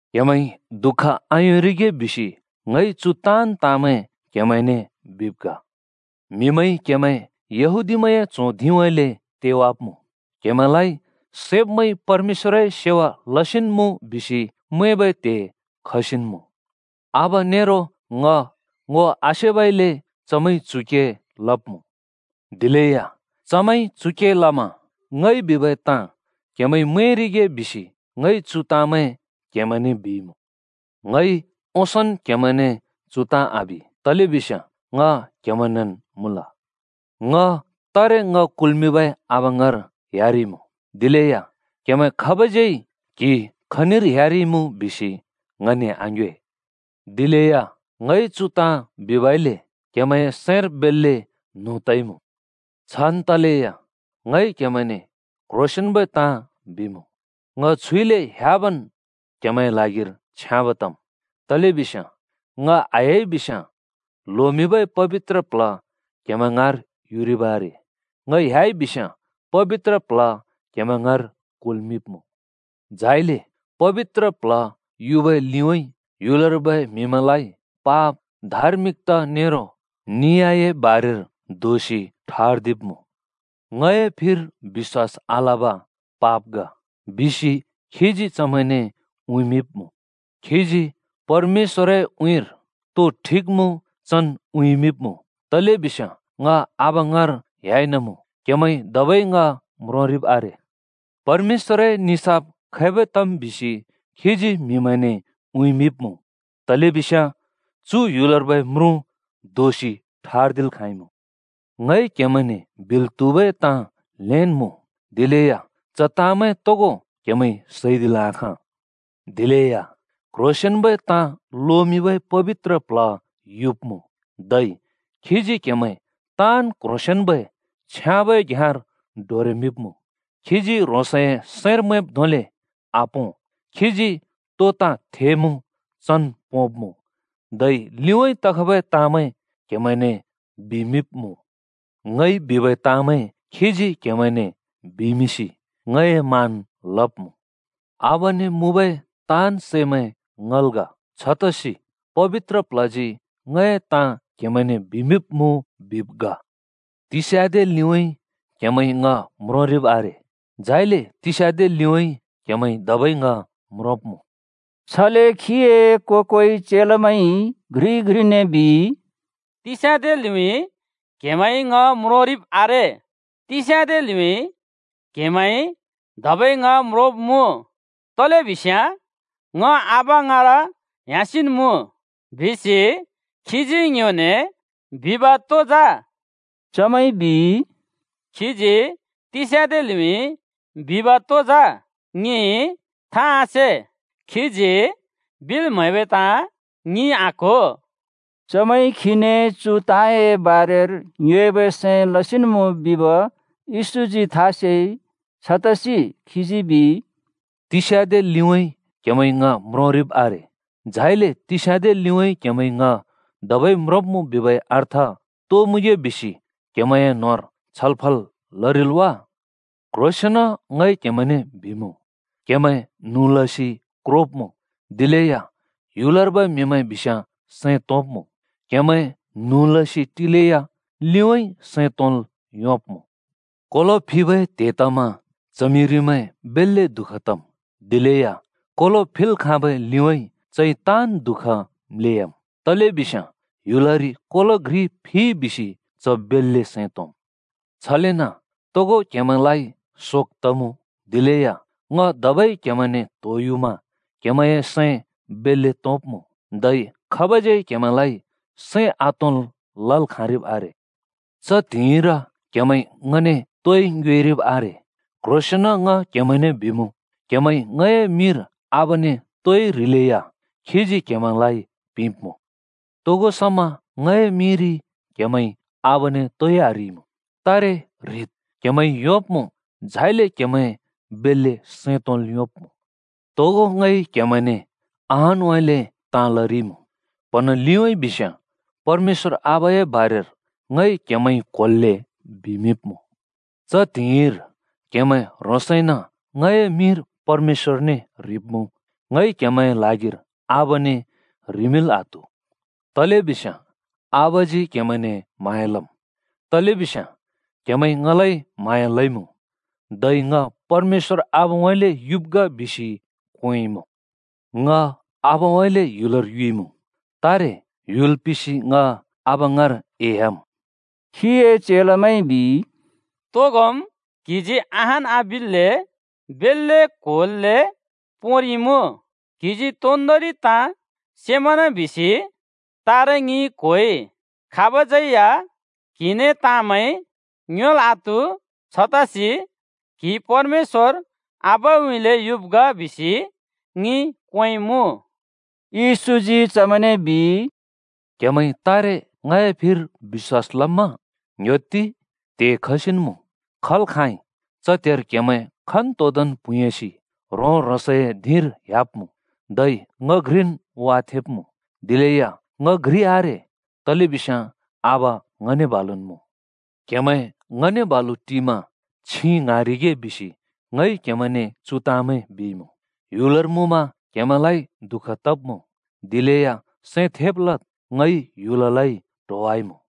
“क्‍हेमैंइ दुःख आयोंरिगे बिसि ङइ चु ताँन् ताँमैं क्हेमैंने बिब् ग। म्हिमैंइ क्हेमैं यहूदीमैंए च्हों धिंउँइँले तेवाब्मुँ। क्हेमैंलाइ सैब्मैंइ परमेश्‍वरए सेवा लसिन् मुँ बिसि मैंबै त्हे खसिन् मुँ। आबा नेरो ङ ङो आसेबइले चमैंइ चु के लब्मुँ। दिलेया चमैंइ चु के लमा ङइ बिबै ताँ क्हेमैंइ मैंरिगे बिसि ङइ चु ताँमैं क्हेमैंने बिइमुँ। “ङइ ओंसोंन् क्हेमैने चु ताँ आबि, तलेबिस्याँ ङ क्हेमैंनेन् मुँल। ङ तारे ङ कुल्मिंबै आबा ङाँर ह्‍याइनमुँ, दिलेया क्हेमैं खाबज्यै ‘क्हि खनिर ह्‍याइनमुँ?’ बिसि ङने आङ्योए। दिलेया ङइ चु ताँ बिबइले क्हेमैंए सैंर बेल्‍ले न्हुँ तइमुँ। छान् तलेया ङइ क्हेमैंने क्ह्रोंसेंन्बै ताँ बिमुँ, ङ छुइले ह्‍याबन् क्हेमैंए ल्हागिर छ्याँब् तम्। तलेबिस्याँ ङ आह्‍याइ बिस्याँ ल्होमिंबै पबित्र प्ल्ह क्हेमैं ङाँर युरिब् आरे। ङ ह्‍याइ बिस्याँ पबित्र प्ल्ह क्हेमैं ङाँर कुल्मिंब्मुँ। झाइले पबित्र प्ल्ह युबै लिउँइँ ह्‍युलर्बै म्हिमैंलाइ पाप, धार्मिकता नेरो नियाए बारेर दोषि ठर्दिब्मुँ। ङए फिर बिश्‍वास आलब पाप ग बिसि खीजी चमैंने उँइँमिंब्मुँ। खीजी परमेश्‍वरए उँइँर तो ठिक मुँ चन् उँइँमिंब्मुँ तलेबिस्याँ ङ आबा ङाँर ह्‍याइनमुँ, क्हेमैंइ धबै ङ म्रोंरिब् आरे। परमेश्‍वरए निसाफ खैबै तम् बिसि खीजी म्हिमैंने उँइँमिंब्मुँ। तलेबिस्याँ चु ह्‍युलर्बै म्रुँ दोषि ठर्दिल् खाँइमुँ। “ङइ क्‍हेमैंने बिल् त्‍हुबै ताँ ल्‍हेन् मुँ, दिलेया च ताँमैं तोगो क्हेमैंइ सैदिल् आखाँ। दिलेया क्ह्रोंसेंन्बै ताँ लोमिंबै पबित्र प्ल्ह युब्मुँ, धै खीजी क्हेमैं ताँन् क्ह्रोंसेंन्बै छ्याँबै घ्याँर डोरेमिंब्मुँ। खीजी ह्रोंसए सैंर मैंब् धोंले आपों। खीजी तो ताँ थेमुँ चन् पोंब्मुँ, धै लिउँइँ तखबै ताँमैं क्हेमैंने बिमिंब्मुँ। ङइ बिबै ताँमैं खीजी क्हेमैंने बिमिंसि ङए मान लब्मुँ। आबाने मुँबै ताँन् सैमैं ङल् ग। छतसि पबित्र प्ल्हजी ङए ताँ क्हेमैंने बिमिंब्मुँ बिब् ग। “तिस्‍याँदे लिउँइँ क्‍हेमैंइ ङ म्रोंरिब् आरे, झाइले तिस्याँदे लिउँइँ क्हेमैंइ धबै ङ म्रोंब्मुँ।” छले खीए को-कोइ चेलामैंइ घ्रिइ-घ्रिने बिइ, “‘तिस्‍याँदे लिउँइँ क्‍हेमैंइ ङ म्रोंरिब् आरे। तिस्याँदे लिउँइँ क्हेमैंइ धबै ङ म्रोंब्मुँ, तलेबिस्याँ ङ आबा ङाँर ह्‍यासिन् मुँ।’ बिसि खीजी ङ्योने बिब तो जा?” चमैंइ बिइ, “खीजी ‘तिस्‍याँदे लिउँइँ’ बिब तो जा? ङिइ था आसे, खीजी बिल् म्हैबै ताँ ङिइ आक्हो।” चमैंइ खीने चु ताँए बारेर ङ्योएबै सैं लसिन् मुँ बिब येशूजी था सेइ। छतसि खीजी बिइ, “‘तिस्‍याँदे लिउँइँ क्‍हेमैंइ ङ म्रोंरिब् आरे, झाइले तिस्याँदे लिउँइँ क्हेमैंइ ङ धबै म्रोंब्मुँ,’ बिबै अर्थ तो मुँगे बिसि क्हेमैंए न्होंर छलफल लरिल् वा? क्ह्रोंसेंन ङ क्हेमैंने बिमुँ, क्हेमैं न्हुँ लसि क्रोब्मुँ, दिलेया ह्‍युलर्बै म्हिमैं बिस्याँ सैं तोंब्मुँ। क्हेमैं न्हुँ लसि टिलेया लिउँइँ सैं तोंल् योंब्मुँ। कोलो फिबै त्‍हे तमा च्हमिरिमैं बेल्‍ले दुःख तम्, दिलेया कोलो फिल् खाँब लिउँइँ चइ ताँन् दुःख म्‍ले‍याम्। तलेबिस्याँ ह्‍युलरि कोलो घ्रि फिइ बिसि च बेल्‍ले सैं तोंम्। छलेन तोगो क्हेमैंलाइ शोक तमुँ। दिलेया ङ धबै क्‍हेमैंने त्‍होयुमा क्‍हेमैंए सैं बेल्‍ले तोंब्‍मुँ। धै खाबज्यै क्हेमैंलाइ सैं आतोंल् लल् खाँरिब् आरे। “च त्‍हिंइर क्‍हेमैंइ ङने तोइ ङ्योएरिब् आरे। क्ह्रोंसेंन ङ क्हेमैंने बिमुँ, क्हेमैंइ ङए मिंर आबाने तोइ ह्रिलेया खीजी क्हेमैंलाइ पिंब्‍मुँ। तोगो समा ङए मिंरि क्‍हेमैंइ आबाने तोइ आह्रिइमुँ। तारे ह्रिद् क्‍हेमैंइ योंब्मुँ। झाइले क्‍हेमैं बेल्‍ले सैं तोंल् योंब्‍मुँ। “तोगो ङइ क्हेमैंने अहानउँइँले ताँ लरिइमुँ। प्हँन लिउँइँ बिस्याँ परमेश्‍वर आबाए बारेर ङइ क्हेमैंइ क्होल्‍ले बिमिंब्मुँ। च त्हिंइर क्‍हेमैं ह्रोंसइन ङए मिंर परमेश्‍वरने ह्रिब्मुँ। ङइ क्‍हेमैंए ल्हागिर आबाने ह्रिमिंल् आत्हु। तलेबिस्याँ आबाजी क्‍हेमैंने म्हाँया लम्। तलेबिस्याँ क्हेमैंइ ङलाइ म्हाँया लइमुँ, धै ङ परमेश्‍वर आबाउँइँले युब् ग बिसि क्वेंइमुँ। ङ आबउँइँले ह्‍युलर युइमुँ, तारे ह्‍युल पिसि ङ आबा ङाँर एह्‍याम्।” खीए चेलामैंइ बिइ, “तोगोम् क्हिजी अहान आबिल्‍ले बेल्‍ले क्होल्‍ले पोंरिइमुँ। क्हिजी तोन्दोंरि ताँ सेमना बिसि तारे ङिइ क्होइ। खाबज्यै या क्हिने ताँमैं ङ्योएल् आत्हु। छतसि क्हि परमेश्‍वर आबाउँइँले युब् ग बिसि ङिइ क्वेंइमुँ।” येशूजी चमैंने बिइ, “क्हेमैंइ तारे ङए फिर बिश्‍वास लम्मा? ङ्ह्‍योत्ति! त्हे खसिन् मुँ, खल् खाँइ। च त्हेर क्हेमैं खन्तोदोंन् प्हुँयासि ह्रों-ह्रोंसए धिंर ह्‍याब्मुँ धै ङ घ्रिन् वाथेंब्मुँ। दिलेया ङ घ्रि आरे, तलेबिस्याँ आबा ङने बालुन् मुँ। “क्हेमैं ङने बालु टिमा छिं ङ्हाँरिगे बिसि ङइ क्हेमैंने चु ताँमैं बिइमुँ। ह्‍युलर मुँमा क्हेमैंलाइ दुःख तब्मुँ, दिलेया सैं थेब लद्। ङइ ह्‍युललाइ ट्होवाइमुँ।”